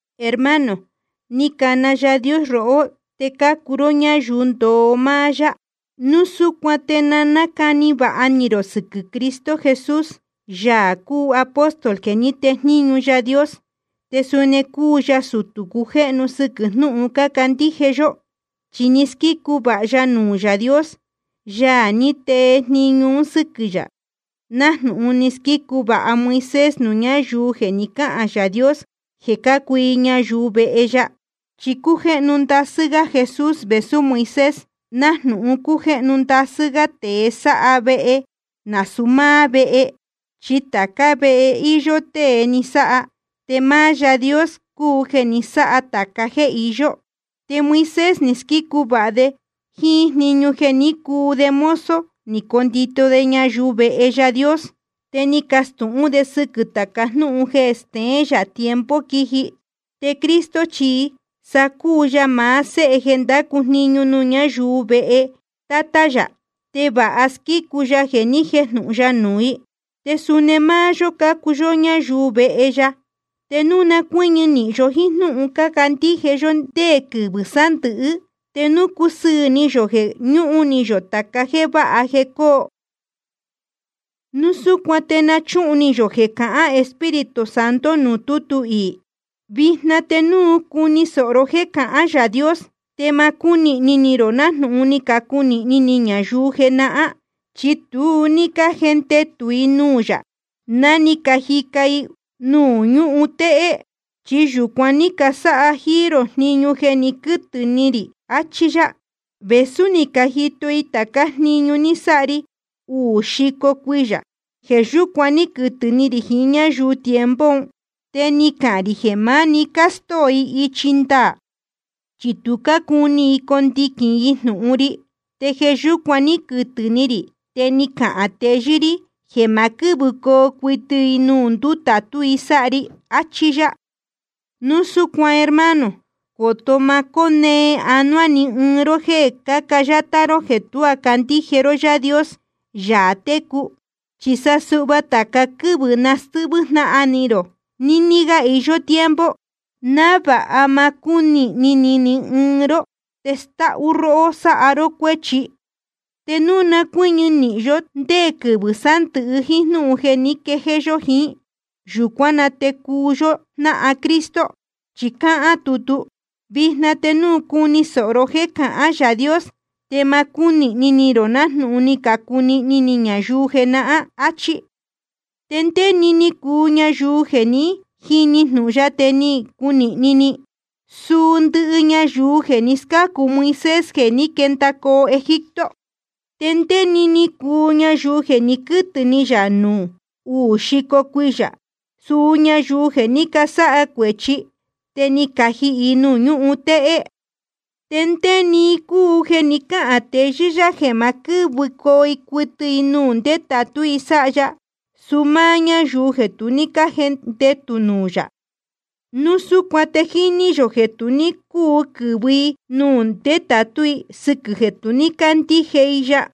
Hermano, ni cana Yaā Dios rohó, te cácuu ró ñáyuu ndoo máá yá. Núu súcuan te na nácani vāha ni rō sɨquɨ̄ Cristo Jesús, Yaā cúu apóstol jeē ní tejníñu Yaā Dios, te suni cúu ya sutū cujéhnu sɨquɨ̄ jnúhun cácandíje yó. Chi ni squícu vāha ya nuū Yaā Dios, Yaā ní tee jniñu un sɨ́quɨ̄ yā, nájnūhun ni squícu vāha Moisés nuū ñáyuu jeē ni cáhān Yaā Dios jeē cácuu i ñayuu vehe ya. Chi cújéhnu ndasɨ́ gá Jesús vēsú Moisés, nájnūhun cújéhnu ndasɨ́ gá tēe sáha vehe nasūu máá vehe. Chi tācá vehe íyó tée ni sáha. Te máá Yaā Dios cúu jeē ni sáha tāca jéē iyó. Te Moisés ni squícu vāha de jíín jniñu jeē ní cuu de mozo ni condito de ñayuu vehe Yaā Dios. Te ni castūhún de sɨquɨ̄ tāca jnúhun jeē steén yā tiempo quiji. Te Cristo chi sa cúu ya maá Séhe jeē ndácu jniñu nuū ñáyuu vehe Tátá yā, te vāha squícu ya jeē ni jéjnūhun ya nuū i. Te suni máá yó cácuu ñayuu vehe ya, te núu na cuɨ́ñɨ nīhin yó jíín jnúhun cándíje yó ndé quɨvɨ̄ sándɨ̄hɨ́, te núu cúsɨɨ̄ ni yō jeē ñúhun ni yō tāca jéē váha jeē coo. Núu súcuan te na chúhun ni yō jeē cahán Espíritu Santo nuū tútu iī: Vijna te núu cuni sōho ró jéē cahán Yaā Dios, te ma cúnīhni ni rō nájnūhun ni cacunīhni ni ñayuu jenahán. Chi tu ní cájendetū i nuū yā ná ni cajica i nuū ñúhun téhé. Chi yūcuan ní casáha jíí rō jniñu jeē ni quɨ́tɨ̄ ni rī, achí yá, vēsú ni cajito i tācá jniñu ni sáha ri uū xico cuiyā. Jeē yúcuan ní quɨtɨ̄ ni rī jiín ñáyuu tiempo un. Te ni cahān rī jeē máni jeē castóo i ichi ndaā, chi tu cácuni i condiquīn i jnūhun ri. Te jeē yúcuan ní quɨtɨ̄ ni rī, te ni cahān teyɨ́ rí jeē ma quɨ́vɨcoo cuɨtɨ i nuū ndetātú i sáha ri. Achí yá. Núu súcuan hermano, coto má conéé ánuá ni ɨɨn ró jéē cáca yátá ró jeē tuá candíje ró Yaā Dios, Yaā técu. Chi sa suhva tāca quɨ́vɨ̄ na stɨ́hvɨ́ jnáhan ni rō, níní gá iyó tiempo, návāha ma cúnīhni ni ni ɨɨn ró te stáhú róhó sáha ró cuéchi. Te núu na cuɨ́ñɨ nīhin yó ndé quɨvɨ̄ sándɨ̄hɨ jíín jnúhun jeē ní quejéé yó jiín, yūcuán na te cuu yó jnáhan Cristo. Chi cáhán tutu: Vijna te núu cuni sōhó ró jéē cahán Yaā Dios, te ma cúnīhni ni rō nájnūhun ni cunīhni ni ñayuu jenahán. Achí. ¿Te ndé‑ni cúu ñayuu jeē ní jini jnūhun ya te ni cunīhni ni? Suu ndɨhɨ ñayuu jeē ni scácu Moisés jeē ní quendacoo Egipto. ¿Te ndé‑ni cúu ñayuu jeē ni quɨ́tɨ̄ ni yā nuū uū xico cuiyā? Suu ñayuu jeē ní casáha cuēchi, te ni cajihī i nuū ñúhun téhé. ¿Te ndé‑ni i cúu jeē ni cáhān teyɨ́ yá jeē ma quɨ́vɨcoo cuɨtɨ i nuū ndetātú i sáha ya? Suu máá ñáyuu jeē tu ní cájendetū nuū yā. Núu súcuan te jíní yō jeē tu ní cúu quɨ̄vɨcoo i nuū ndetātú i, sɨquɨ̄ jeē tu ní cácandíje i ya.